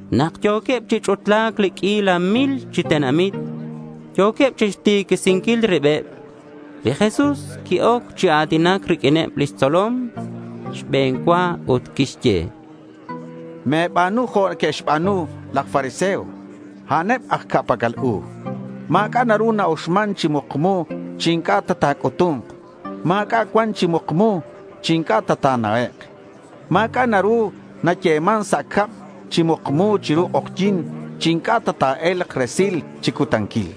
Nak yo̱queb chi ch'utla̱c li q'uila mil chi tenamit, yo̱queb chixtiquisinquil ribeb. Li Jesús qui-oc chi a̱tinac riq'uineb lix tzolom xbe̱n cua ut quixye: —Me̱ba̱nu jo' neque'xba̱nu laj fariseo. A'aneb aj ca'pac'al u. Ma̱c'a' naru na-uxman chi mukmu chi inc'a' ta ta̱c'utu̱nk. Ma̱c'a' cuan chi mukmu chi inc'a' ta ta̱na'ek'. Ma̱c'a' naru nayeman sa' cab chi mukmu chiru k'ojyi̱n chi inc'a' ta ta̱e̱lk resil chi cutanquil.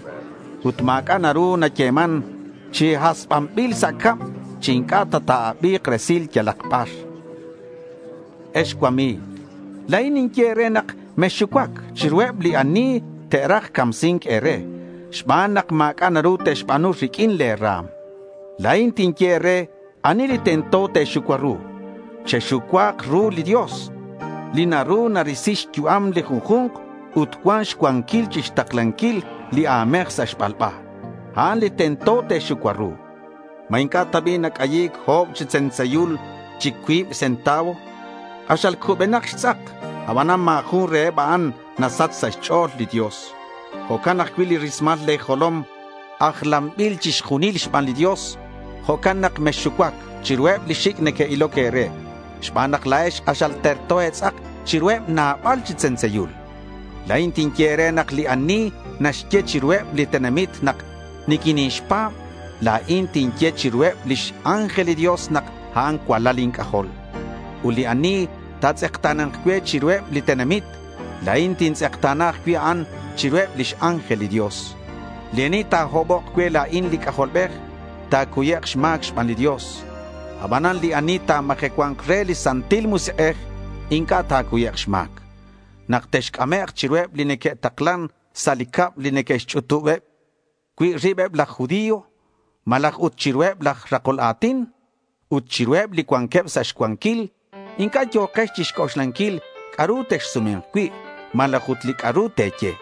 Ut ma̱c'a' naru nayeman chi hasbanbil sa' cab chi inc'a' ta ta̱abi̱k resil yalak bar. Ex cuami̱g, la̱in ninye e̱re nak mexxucuac chiruheb li ani te'raj camsi̱nc e̱re xban nak ma̱c'a' naru te'xba̱nu riq'uin le̱ ra̱m. La̱in tinye e̱re ani li tento te̱xucua ru. Chexucua̱k ru li Dios li naru ta̱risi xyu'am li junju̱nk ut cuan xcuanquil chixtaklanquil li a̱mej sa' xbalba. A'an li tento te̱xucua ru. ¿Ma inc'a' ta bi' nac'ayi̱c o̱b chi tzentzeyul chi cuib centavo? K'axal cubenak xtz'ak, abanan ma̱ jun reheb a'an nasach sa' xch'o̱l li Dios. Jo'can ajcui' li rismal le̱ jolom ajlanbileb chixjunil xban li Dios. Jo'can nak mexxucuac chiruheb li xic' neque'iloc e̱re xban nak la̱ex k'axal terto e̱tz'ak chiruheb nabal chi tzentzeyul. La̱in tinye e̱re nak li ani naxye chiruheb li tenamit nak niquinixpa̱b, la̱in tinye chiruheb lix ángel li Dios nak a'an cualal inc'ajol. Ut li ani ta̱tz'ekta̱na̱nk cue chiruheb li tenamit, la̱in tintz'ekta̱na ajcui' a'an chiruheb lix ángel li Dios. Li ani ta̱hobok cue la̱in li C'ajolbej, ta̱cuyek' xma̱c xban li Dios. Abanan li ani ta̱majecua̱nk re li Santil Musik'ej inc'a' ta̱cuyek' xma̱c. Nak texc'amek' chiruheb li neque'taklan sa' li cab li neque'xch'utub cui' ribeb laj judío, malaj ut chiruheb laj rakol a̱tin ut chiruheb li cuanqueb sa' xcuanquil, inc'a' yo̱kex chixc'oxlanquil li c'a'ru texsume̱nk cui' malaj ut li c'a'ru te̱ye,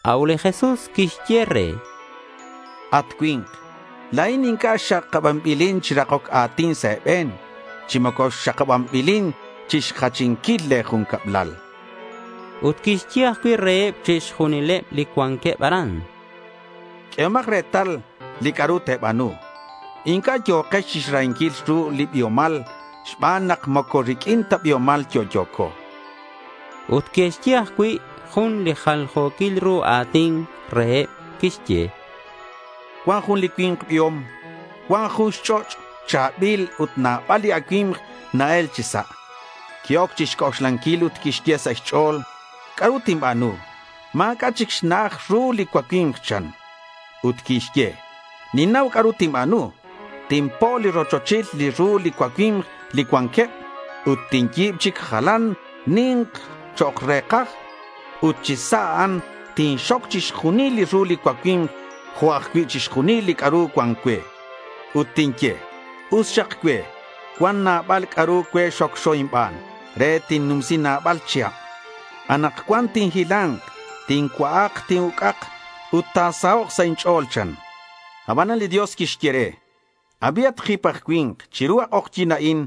A'ut li Jesús quixye re: —At cui̱nk, la̱in inc'a' xakabanbilin chi rakoc a̱tin sa' e̱be̱n chi moco xakabanbilin chixjachinquil le̱ jun cablal. Ut quixye ajcui' reheb chixjunileb li cuanqueb aran: —Q'uehomak retal li c'a'ru te̱ba̱nu. Inc'a' yo̱kex chixrahinquil ru li biomal, xban nak moco riq'uin ta kabiomal yo'yo̱co, chan. Ut quixye ajcui' jun li jaljo̱quil ru a̱tin reheb. Quixye: —Cuan jun li cui̱nk biom. Cuan jun xch'och' cha̱bil ut nabal li acui̱mk na-el chi sa'. Qui-oc chixc'oxlanquil ut quixye sa' xch'o̱l, “¿C'a'ru tinba̱nu? Ma̱c'a' chic xna'aj li ru li cuacui̱mk”, chan. Ut quixye, “Ninnau c'a'ru tinba̱nu. Tinpo' li rochochil li ru li cuacui̱mk li cuanqueb. Ut tinyi̱b chic jalan ni̱nk chok' re̱kaj. Ut chi sa' a'an tinxoc chixjunil li ru li cuacui̱mk jo' ajcui' chixjunil li c'a'ru cuan cue.” Ut tinye: “Us xak cue. Cuan nabal c'a'ru cue xocxo inban re tinnumsi nabal chihab. Anakcuan tinhila̱nk, tincua'ak, tin-uc'ak, ut ta̱sahok' sa' inch'o̱l”, chan. Abanan li Dios quixye re, “Abi, at jip aj cui̱nk. Chiru a k'ojyi̱n a'in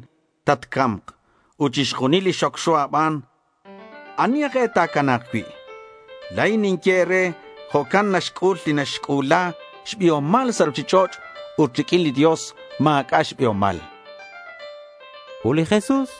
tatca̱mk. Ut chixjunil li xocxo a̱ban, ¿ani aj e ta̱cana̱k cui'?” La̱in ninye e̱re: jo'ca'in naxc'ul li naxc'u̱la xbiomal sa' ruchich'och' ut riq'uin li Dios ma̱c'a' xbiomal, chan li Jesús.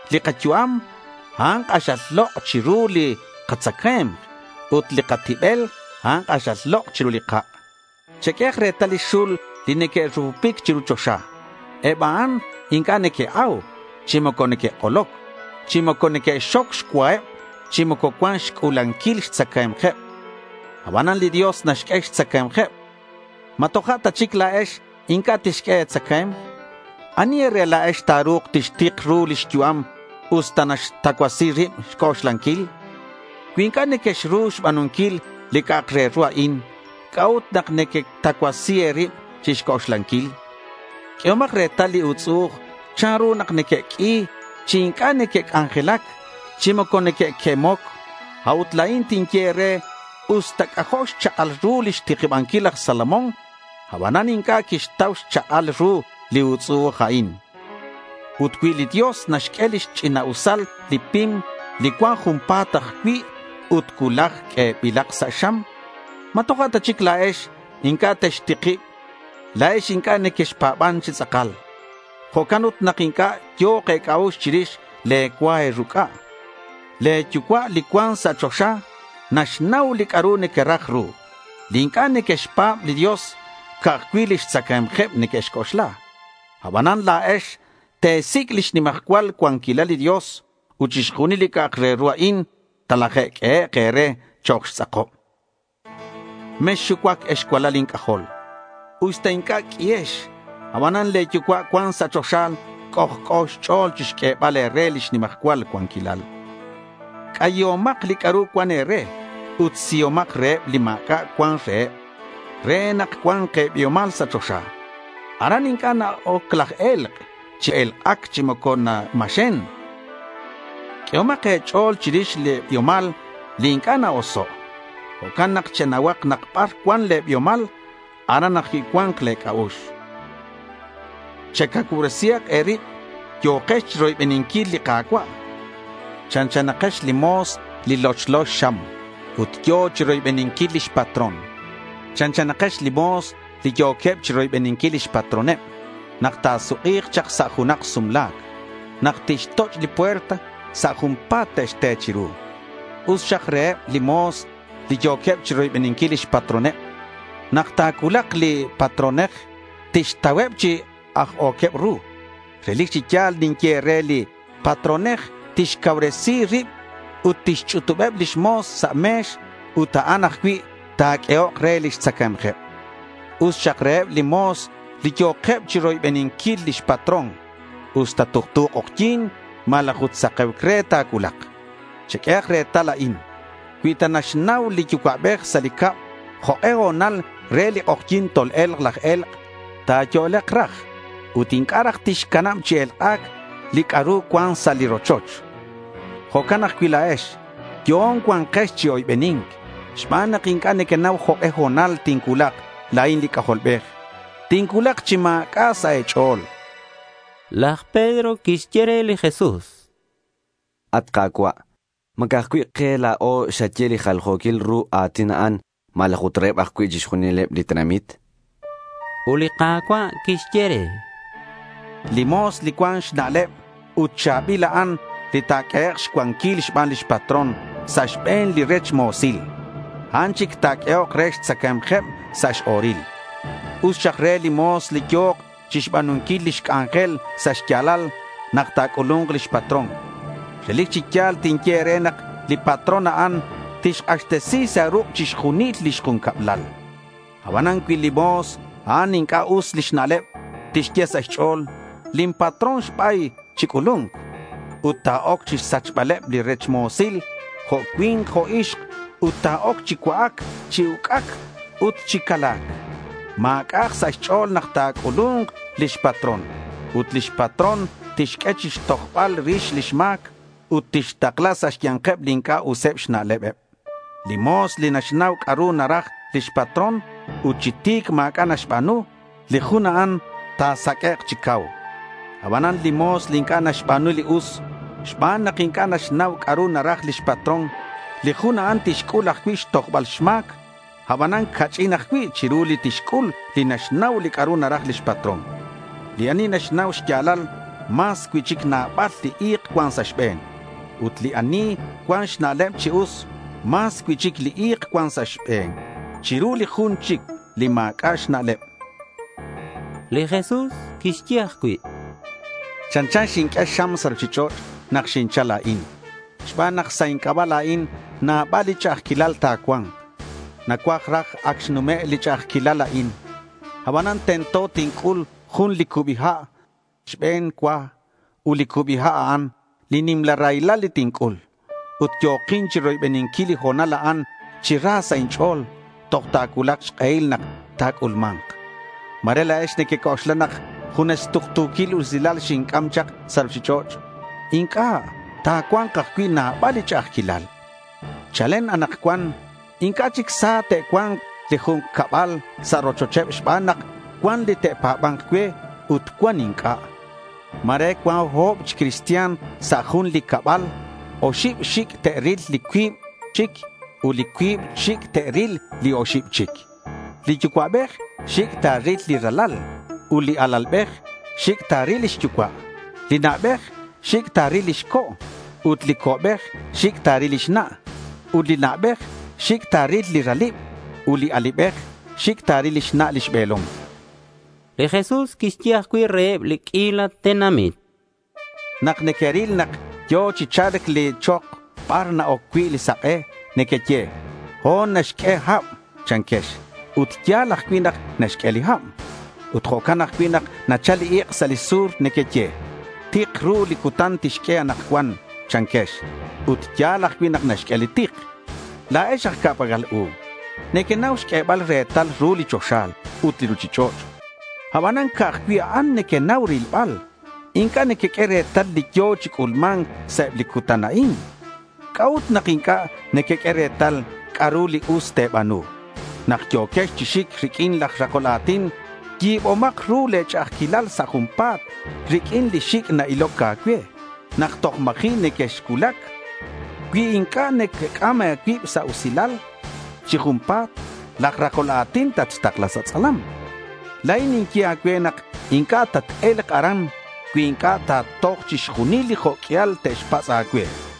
Li kayu'am, a'an k'axal lok' chiru li katzacae̱mk. Ut li katibel, a'an k'axal lok' chiru li kak'. Cheq'uehak retal li xul li neque'rupupic chiru choxa. Eb a'an inc'a' neque'au, chi moco neque'k'oloc, chi moco neque'xxoc xcuaheb chi moco cuan xc'ulanquil xtzacae̱mkeb. Abanan li Dios naxq'ue xtzacae̱mkeb. ¿Ma toja' ta chic la̱ex inc'a' tixq'ue e̱tzacae̱mk? ¿Ani e̱re la̱ex ta̱ru̱k tixtik ru lix yu'am usta naxtacuasi rib xc'oxlanquil? Cui inc'a' nequexru xba̱nunquil li c'a'ak re ru a'in, ¿c'a'ut nak nequetacuasi e̱rib chixc'oxlanquil? Q'uehomak retal li utz'u'uj chanru nak neque'q'ui chi inc'a' neque'c'anjelac chi moco neque'quemoc. A'ut la̱in tinye e̱re, usta c'ajo' xchak'al ru lix tikibanquil laj Salomón, abanan inc'a' quixtau xchak'al ru li utz'u'uj a'in. Ut cui li Dios naxq'ue lix ch'ina'usal li pim li cuan junpa̱t ajcui' ut cuulaj q'uebilak sa' xam, ¿ma toja' ta chic la̱ex inc'a' textikib? La̱ex inc'a' nequexpa̱ban chi tz'akal. Jo'can ut nak inc'a' yo̱k e̱c'a'ux chirix le̱ cua e̱ruc'a. Le̱ yucua' li cuan sa' choxa naxnau li c'a'ru nequeraj ru. Li inc'a' neque'xpa̱b li Dios, ca'aj cui' lix tzacae̱mkeb neque'xc'oxla. Abanan la̱ex te̱sic' lix nimajcual cuanquilal li Dios ut chixjunil li c'a'ak re ru a'in talajq'uehek' e̱re chok' xtz'akob. Mexxucuac ex cualal inc'ajol. Usta inc'a' q'uihex, abanan le̱ yucua' cuan sa' choxa c'ojc'o xch'o̱l chixq'uebal e̱re lix nimajcual cuanquilal. C'ayihomak li c'a'ru cuan e̱re ut sihomak reheb li ma̱c'a' cuan reheb re nak cua̱nk e̱biomal sa' choxa. Aran inc'a' na-oc laj e̱lk' chi elk'ac chi moco namaxen. Q'uehomak e̱ch'o̱l chirix li biomal li inc'a' na-oso'. Jo'can nak chenauhak nak bar cuan cui' le̱ biomal, aran ajcui' cua̱nk le̱ c'a'ux. Checauresihak e̱rib. Yo̱kex chiroybeninquil li Ka̱cua'. Chanchanakex li mo̱s li lochlo xxam ut yo̱ chiroybeninquil lix patrón. Chanchanakex li mo̱s li yo̱queb chiroybeninquil lix patroneb nak ta̱suk'i̱k chak sa' junak sumla̱c. Nak tixtoch' li puerta, sa' junpa̱t te'xte chiru. Us xak reheb li mo̱s li yo̱queb chiroybeninquil lix patroneb. Nak ta̱cuulak li patronej, tixtauheb chi ajo̱queb ru. Relic chi ya̱l ninye e̱re li patronej tixcauresi rib ut tixchunubeb lix mo̱s sa' me̱x ut a'an ajcui' ta̱q'uehok re lix tzacae̱mkeb. Us xak reheb li mo̱s li yo̱keb chiroybeninquil lix patrón, usta tuktu k'ojyi̱n malaj ut sake̱uc re ta̱cuulak. Cheq'uehak retal a'in: Cui ta naxnau li yucua'bej sa' li cab jok'e ho̱nal re li k'ojyi̱n tol-e̱lk laj e̱lk', ta̱yo'lek raj ut inc'a' raj tixcanab chi elk'ac li c'a'ru cuan sa' li rochoch. Jo'can ajcui' la̱ex yo'on cua̱nkex chi oybeni̱nc xban nak inc'a' nequenau jok'e ho̱nal tincuulak la̱in li C'ajolbej. Tincuulak chi ma̱c'a' sa' e̱ch'o̱l, chan li Jesús. Laj Pedro quixye re li Jesús: —At Ka̱cua', ¿ma ca'aj cui' ke la̱o xaye li jaljo̱quil ru a̱tin a'an, malaj ut reheb ajcui' chixjunileb li tenamit?— Ut li Ka̱cua' quixye re: —Li mo̱s li cuan xna'leb ut cha̱bil, a'an li ta̱q'uehek' xcuanquil xban lix patrón sa' xbe̱neb li rech mo̱sil. A'an chic ta̱q'uehok re xtzacae̱mkeb sa' x-o̱ril. Us xak re li mo̱s li yo̱k chixba̱nunquil lix c'anjel sa' xya̱lal nak ta̱c'ulu̱nk lix patrón. Relic chi ya̱l tinye e̱re nak li patrón a'an, tixk'axtesi sa ruk' chixjunil lix jun cablal. Abanan cui li mo̱s a'an inc'a' us lix na'leb, tixye sa' xch'o̱l, “Lin patrón ta̱ba̱yk chi c'ulu̱nc”. Ut ta̱oc chixsac'baleb li rech mo̱sil jo' cui̱nk jo' ixk ut ta̱oc chi cua'ac, chi uc'ac ut chi cala̱c. Ma̱c'a'ak sa' xch'o̱l nak ta̱c'ulu̱nk lix patrón. Ut lix patrón tixq'ue chixtojbal rix lix ma̱c ut tixtakla sa' xya̱nkeb li inc'a' useb xna'leb. Li mo̱s li naxnau c'a'ru naraj lix patrón ut chi ti̱c ma̱c'a' naxba̱nu, li jun a'an ta̱saq'uek' chi cau. Abanan li mo̱s li inc'a' naxba̱nu li us xban nak inc'a' naxnau c'a'ru naraj lix patrón, li jun a'an tixc'ul ajcui' xtojbal xma̱c. Abanan ca'ch'in ajcui' chiru li tixc'ul li naxnau li c'a'ru naraj lix patrón. Li ani naxnau xya̱lal, mas cui'chic nabal li i̱k cuan sa' xbe̱n. Ut li ani cuan xna'leb chi us, mas cui'chic li i̱k cuan sa' xbe̱n chiru li jun li ma̱c'a' xna'leb, chan. Li Jesús quixye ajcui': —Chanchan li xinq'ue xam sa' ruchich'och' nak xinchal la̱in xban nak sa' inc'aba' la̱in nabal li ch'a'ajquilal ta̱cua̱nk. Nacuaj ta ac xnume' li ch'a'ajquilal a'in. Abanan tento tinc'ul jun li cubi ha' xbe̱n cua. Ut li cubi ha', a'an li nimla raylal li tinc'ul. Ut yo̱kin chiroybeninquil li ho̱nal a'an chi ra sa' inch'o̱l toj ta̱cuulak xk'ehil nak ta̱c'ulma̱nk. Ma̱re la̱ex nequec'oxla nak junes tuktu̱quil usilal xinc'am chak sa' ruchich'och'. Inc'a'. Ta̱cua̱nk ajcui' nabal li ch'a'ajquilal. Chalen anakcuan inc'a' chic sa te'cua̱nk li ju̱nk cabal sa' rochocheb xban nak cuan li te'pa̱ba̱nk cue ut cuan inc'a'. Ma̱re cuan o̱b chi cristian sa' li jun cabal. Oxib xic' te'ril li cuib chic. Ut li cuib xic' te'ril li oxib chic. Li yucua'bej xic' ta̱ril li ralal, ut li alalbej xic' ta̱ril lix yucua'. Li na'bej xic' ta̱ril lix co' ut li co'bej xic' ta̱ril lix na'. Ut li na'bej xic' ta̱ril li ralib ut li alibej xic' ta̱ril lix na' lix be̱lom. Li Jesús quixye ajcui' reheb li q'uila tenamit: —Nak nequeril nak yo̱ chi cha̱lc li chok bar na-oc cui' li sak'e, nequeye, “Ho̱n naxq'ue hab”, chanquex. Ut ya̱l ajcui' nak naxq'ue li hab. Ut jo'can ajcui' nak nachal li ik' sa' li sur. Nequeye, “Tik ru li cutan tixq'ue anakcuan,” chanquex. Ut ya̱l ajcui' nak naxq'ue li tik. La̱ex aj ca'pac'al u. Nequenau xq'uebal retal ru li choxa ut li ruchich'och'. Abanan ca'aj cui' a'an nequenau rilbal. Inc'a' nequeq'ue retal li yo̱ chi c'ulma̱nc sa' eb li cutan a'in. ¿C'a'ut nak inc'a' nequeq'ue retal c'a'ru li us te̱ba̱nu? Nak yo̱quex chi xic riq'uin laj rakol a̱tin, yi̱bomak ru le̱ ch'a'ajquil sa' junpa̱t riq'uin li xic' na-iloc a̱cue nak toj ma̱ji' nequexcuulac. Cui inc'a' nacac'am a̱cuib sa' usilal chi junpa̱t, laj rakol a̱tin tatxtakla sa tz'alam. La̱in ninye a̱cue nak inc'a' tat-e̱lk aran cui inc'a' ta̱toj chixjunil li jo' q'uial te'xpatz' a̱cue, chan li Jesús.